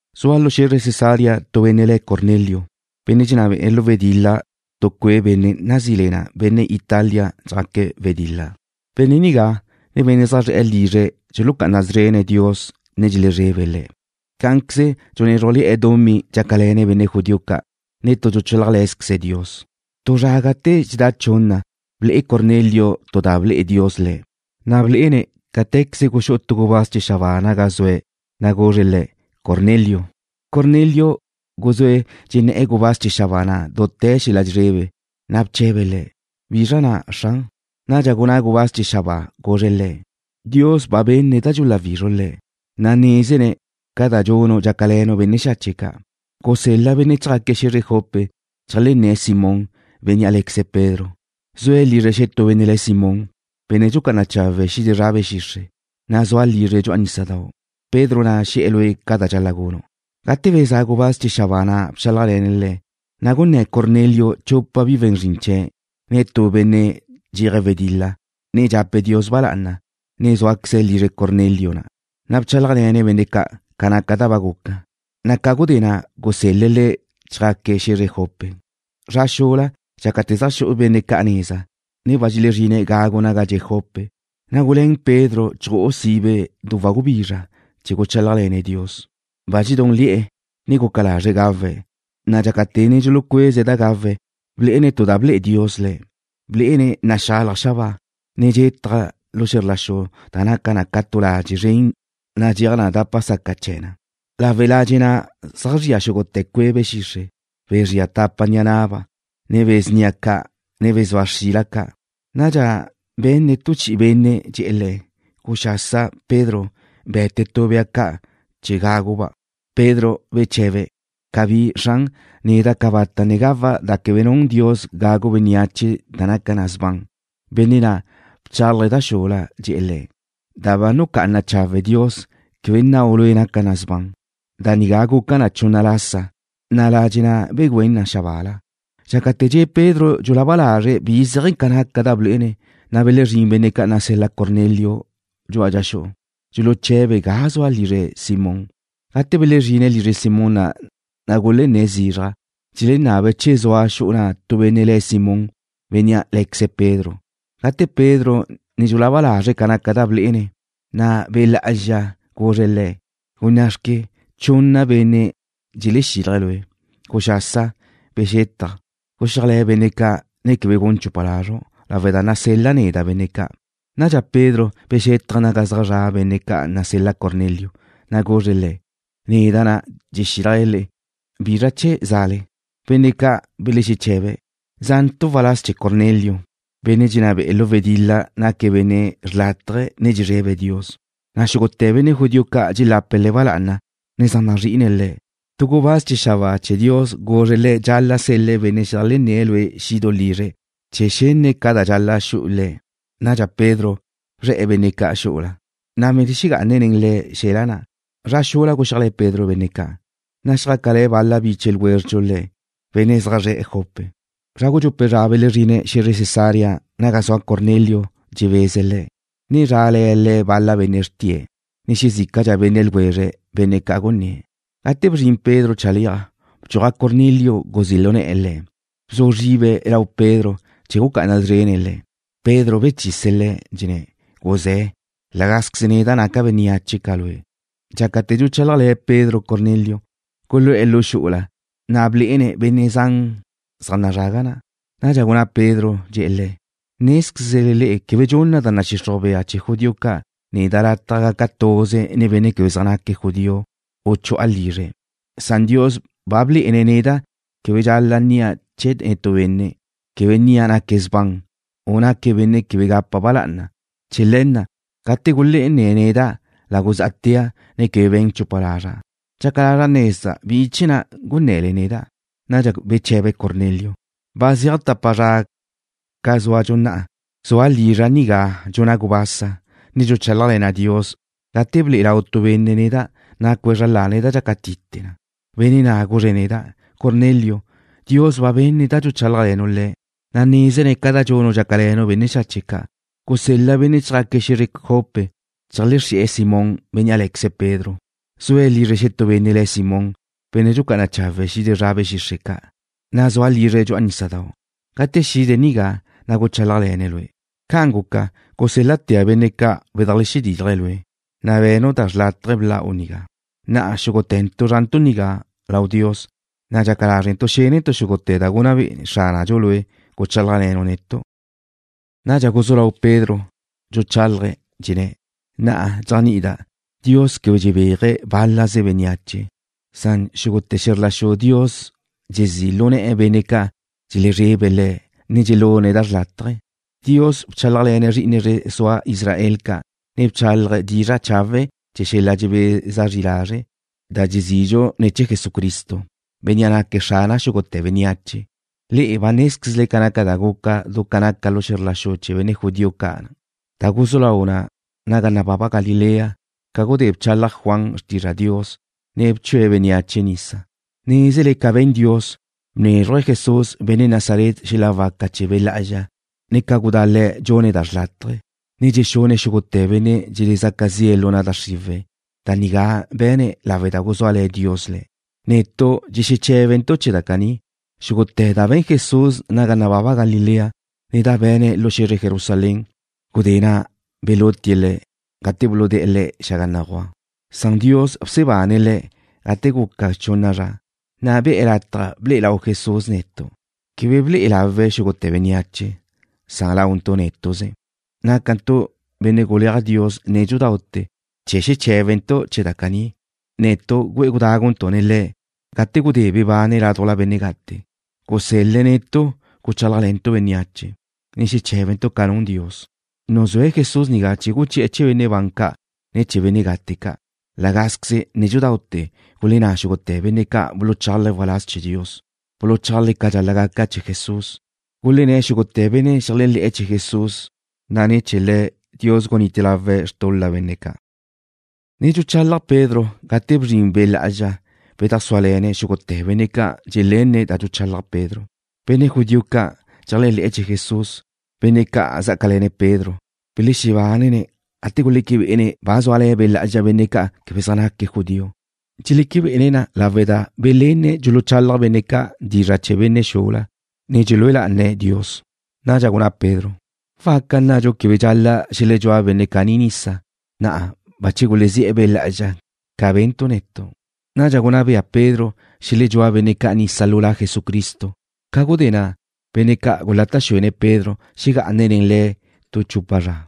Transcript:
Zua lu xe̱zre Cesarea tu benne' le̱' Cornelio, benne' dxenná be'e̱ lu wedil-la tu cue' benne' nazí le na Benne' Italia Zjaque̱' Wedil-la. Benne' nigá, ne benne' zaj zre̱'e̱ lizre̱' dxulucá'ana szrene̱' Dios, ne dxelezrebe̱' Le̱'. Cá'anqueze dxunézrujle̱'e̱ dumí dxácale̱ne̱' benne' judío ca', ne tu dxuchálajle̱zqueze̱' Dios. Tu zra gate dxexedá chunna ble'e Cornelio tu da ble'e Dios le̱', na' blé'ene̱' cáte̱queze guxú'u tu gubáz chee̱ xabáa naga zue̱', na' guzre̱' le̱': ―Cornelio. Cornelio guzúe̱' dxenné̱'e̱ gubáz chee̱ xabáa na' dute̱ xel-la' dxezrebe, na' bche̱be̱' le̱': ―¿Bizra na', Xran? Nadxa gunná gubáz chee̱ xabáa, guzre̱' le̱': ―Dios ba benne̱' da dxuláwizru' Le̱', ne nézene̱' ca da dxunu' dxácale̱nu' benne' xache' ca'. Gusel-la benne' chjaque̱' xe̱zre Jope, cheajlenné̱' Simón, bénnea' lé̱queze̱' Pedro. Zue̱' lizre xetú benne' le̱' Simón, benne' dxucá'ana chawe̱' xide zra be̱ xixre', na' zua lizre̱' dxu'a nísadau'. Pedro na' xe̱'e̱ lue' ca da dxal-la' gunu'. Gate bezá' gubáz chee̱ xabáa na' bchálajle̱ne̱' le̱', na' gunné̱ Cornelio chupa bi we̱n zrin chee̱', ne tu benne' dxeje̱' wedil-la, ne dxape̱' Dios ba lá'ana, ne zúaqueze̱' lizre Cornelio na'. Na' bchálajle̱ne̱' benne' ca' ca naca da ba guca, na' ca gudé na' gusel-le̱' le̱' chjaque̱' xe̱zre Jope. Zra xula, dxácate̱ zaj xu'e̱ benne' ca' neza, ne ba dxezrine̱' gagu naga dxe' Jope, na' guluén Pedro chju'u sibe du wagubizra chee̱ guchálajle̱ne̱' Dios. Ba dxedúnle̱'e̱, ne guca lazre̱' gawe̱', na' dxácate̱ ne dxulucueze̱' da gawe̱', blé'ene̱' tu da ble'e Dios le̱'. Blé'ene̱' naxalaj xabáa, ne dxetaj lu xe̱zr la xu da naca na ca tu ladxe' zren nadxéaj na dápate̱ la'a chee̱ na. Lawe' ladxe' na' zaj zria xúgute̱ cue' be̱ xixre', be̱ zria tapa ni'a na'ba', ne be̱ snia ca', ne be̱ zua xrila ca'. Nadxa benne̱' tu chi'i benne' dxe̱'e̱ le̱': ―Guxasa, Pedro. Be̱te tu bea ca' chee̱ gagu'-ba'. Pedro beche̱be̱': ―Cabí, Xran. Neda' cabata' ne gawa' da quebe nun Dios gagu bénneache, ne quegá da naca na sban. Benne' na' bchálaje̱' da xula, dxe̱'e̱ le̱': ―Da ba nucá'ana chawe' Dios, quebe nnau' lue' naca na sban. Da nigá guca na chunna lasa, na' ladxe' na' begüén na xabáala. Dxácate̱ dxe' Pedro dxulaba lazre̱' bi zéaje̱ ca naca da blé'ene̱', na' belezrín benne' ca' nasel-la Cornelio dxu'a dxa xu'u, dxuluche̱be̱' ga zua lizre Simón. Gate belezrine̱' lizre Simón na', na' gulenné̱' zizraj, dxelenabe̱' che zua xu'u na' tu benne' le̱' Simón, bénnea' lé̱queze̱' Pedro. Gate Pedro ne dxulaba lazre̱' ca naca da blé'ene̱', na' Be' Lá'azxa guzre̱' le̱': ―Gunná'xque, chunna benne' dxelexílaje̱' lue'. Guxasa, bexetaj. Guxíajle̱ benne' ca', ne quebe gun chupa lazru' lawe' da nasel-la' neda' benne' ca'. Nadxa Pedro bexétaje̱' naga zaj zra' benne' ca' nasel-la Cornelio, na' guzre̱' le̱': ―Neda' na' dxexílajle le'e. ¿Bizra chee̱ za'le? Benne' ca' belexeche̱be̱': ―Za'ntu' waláz chee̱ Cornelio, benne' dxenná be'e̱ lu wedil-la. Naque̱' benne' xrlátaje, ne dxezrebe̱' Dios, na' xúgute̱ benne' judío ca' dxelape̱' le̱' ba lá'ana, ne zaj nazrí'ine̱' le̱'. Tu gubáz chee̱ xabáa chee̱ Dios guzre̱' le̱' dxal-la' sel-le̱' benne' xedajlenné̱' lue' xidu' lizre̱' chee̱ xenne̱' ca da dxal-la' xu'u le̱'. Nadxa Pedro bzre̱'e̱ benne' ca' xu'u na', na' belexegá'ane̱' nen le̱' xe̱la na'. Zra xula guxíajle̱ Pedro benne' ca', na' xjácale̱ bal-la biche ljwézredxu le̱', benne' zaj zre̱'e̱ Jope. Zra gudxupe' zra belezrine̱' xe̱zre Cesarea naga zua Cornelio dxebeze̱' le̱', ne zrale̱ bal-la benne' xrtie̱' le̱', ne xezícadxa benne' ljwezre̱', benne' ca' gunné̱'. Gate bzrin Pedro chale'aj, bdxuaj Cornelio guzí' lu ne̱'e̱ le̱'. Bzu zribe̱' lau Pedro chee̱ gucá'ana szrene̱' le̱'. Pedro bechise̱' le̱', dxenné̱': ―Guzé̱. La gázqueze neda' naca' bénneache ca lue'. Dxácate̱ dxuchálajle̱ Pedro Cornelio, gulu'e̱ lu xu'ula, na' blé'ene̱' benne' zan zaj nazrague̱' na'. Nadxa gunná Pedro, dxe̱'e̱ le̱': ―Nézquezle le'e quebe dxunna da nadxixruj bea chee̱ judío ca' neda' lataj gaca' tuze nen benne' quebe zaj naque̱' judío u chu'a lizre̱'. Na'a Dios ba blé'ene̱' neda' quebe dxal-la' nnia' chee̱ netú benne', quebe nnia' naque̱' sban, u naque̱' benne' quebe gapa' ba lá'ana. Chee̱ le̱ na', gate gulenné̱' neda', la guzá'tea', ne quebe be̱n chupa lazra'. Dxaca lazra' nezda' bi chee̱ na' gunne̱le neda'. Nadxa beche̱be Cornelio: ―Ba zeaj tapa zra ca zúadxu na'a, zua' lizra' nigá dxuna' gubasa, ne dxuchálajle̱na' Dios, gate ble'e lau tu benne' neda', nacue̱' zra lane̱' da dxácatite na. Benne' na' guzre̱' neda': “Cornelio, Dios ba benne̱' da dxuchálajle̱nu' Le̱', na' nézene̱' ca da dxunu' dxácale̱nu' benne' xache' ca'. Gusel-la benne' chjaque̱' xe̱zre Jope, cheajlexri'e̱ Simón, bénnea' lé̱queze̱' Pedro. Zue̱' lizre xetú benne' le̱' Simón, benne' dxucá'ana chawe̱' xide zra be̱ xixre' ca', na' zua lizre̱' dxu'a nísadau'. Gate xide̱' nigá, na' guchálajle̱ne̱' lue'.” Ca'an guca, gusél-latea' benne' ca' bedajlexedílaje̱' lue', na' be̱nu' da chawe' bla'u nigá. Na'a xúgute̱ntu' zrantu' nigá lau Dios, ne dxaca lázrentu' xénentu' xúgute̱ ca da gunná be'e Xránadxu lue' guchálajle̱nu' netu'. Nadxa guzú lau Pedro dxuchálaje̱', dxenné̱': ―Na'a dxéajni'ida' Dios quebe dxebéaje̱' bál-laze bénneache, Na' xúgute̱ xe̱zr la xu Dios dxezí' lu ne̱'e̱ benne' ca' dxelezrebe Le̱', ne dxelune̱' da xrlátaje. Dios bchálajle̱ne̱' zri'ine zre sua Israel ca', ne bchálaje̱' dizra' chawe' chee̱ xel-la' dxebeza zri lazre', da dxezidxu ne̱ chee̱ Jesucristo, Bénnea' naque̱' Xrana xúgute̱ bénneache. Le'e ba nézquezle ca naca da guca du ca naca lu xe̱zr la xu chee̱ benne' judío ca', da guzú lau na naga nababa Galilea ca gudé bchalaj Juan xrtizra' Dios, ne bchue̱' bénneache nisa. Nézele ca be̱n Dios, bnézruje̱' Jesús, benne' Nazaret, xel-la' waca chee̱ Be' Lá'azxa, ne ca gudá Le̱' dxune̱' da chawe', ne dxexune̱' xúgute̱ benne' dxelezaca zi'e̱ lu na' da xriwe̱'. Da nigá be̱ne̱' lawe' da guzúale̱ Dios Le̱'. Netu' dxexeché̱bentu' chee̱ da caní, xúgute̱ da be̱n Jesús naga nababa Galilea, ne da be̱ne̱' lu xe̱zre Jerusalén. Gudé na' belutie̱' Le̱', gate buludé̱'e̱ Le̱' xaga béguaj, na' Dios bsebane̱' Le̱' gate guca chunna zra, na' be̱'e̱ lataj ble'e lau Jesús netu'. Quebe ble'e lawe̱' xúgute̱ bénneache, san launtu' nétu'ze, nácantu' benne' ca' guleaj Dios nédxudaute̱ chee̱ xeché̱bentu' chee̱ da caní. Netu' güe'e gudáguntu' nen Le̱' gate gudé bebane̱' ládujla benne' gate. Gusel-le̱' netu' guchálajle̱ntu' bénneache, ne xeché̱bentu' ca da nun Dios, nuzúe̱' Jesús nigá chee̱ guchi'e̱ chee̱ benne' ban ca', ne chee̱ benne' gate ca'. La gázqueze nédxudaute̱ gulenná xúgute̱ benne' ca' buluchálaje̱' waláz chee̱ Dios, buluchálaje̱' ca dxal-la' gaca chee̱ Jesús, gulenné̱' xúgute̱ benne' xeléajle̱'e̱ chee̱ Jesús, na' ne̱ chee̱ Le̱' Dios gunite lawe̱' xtul-la benne' ca'. Ne dxuchalaj Pedro gate bzrin Be' Lá'azxa bedajsúale̱ne̱' xúgute̱ benne' ca' dxelenne̱' da dxuchalaj Pedro. Benne' judío ca' dxeléajle̱'e̱ chee̱ Jesús, benne' ca' zá'acale̱ne̱' Pedro, belexebánene̱' gate guleque bé'ene̱' ba zúale̱ Be' Lá'azxa benne' ca' quebe zaj naque̱' judío. Dxeleque bé'ene̱' na lawe' da belenne̱' dxuluchalaj benne' ca' dizra' chee̱ benne' xula, ne dxelúe lá'ane̱' Dios. Nadxa gunná Pedro: ―¿Waca nnadxu quebe dxal-la' xeledxúa benne' caní nisa, benne' ca' bache gulezí'e̱ Be' Lá'azxa ca be̱ntu' netu'? Nadxa gunná bea Pedro xeledxúa benne' ca' nisa lu La Jesucristo. Gudé na', benne' ca' gulata' xuene̱' Pedro xegá'ane̱' nen le̱' tu chupa zra.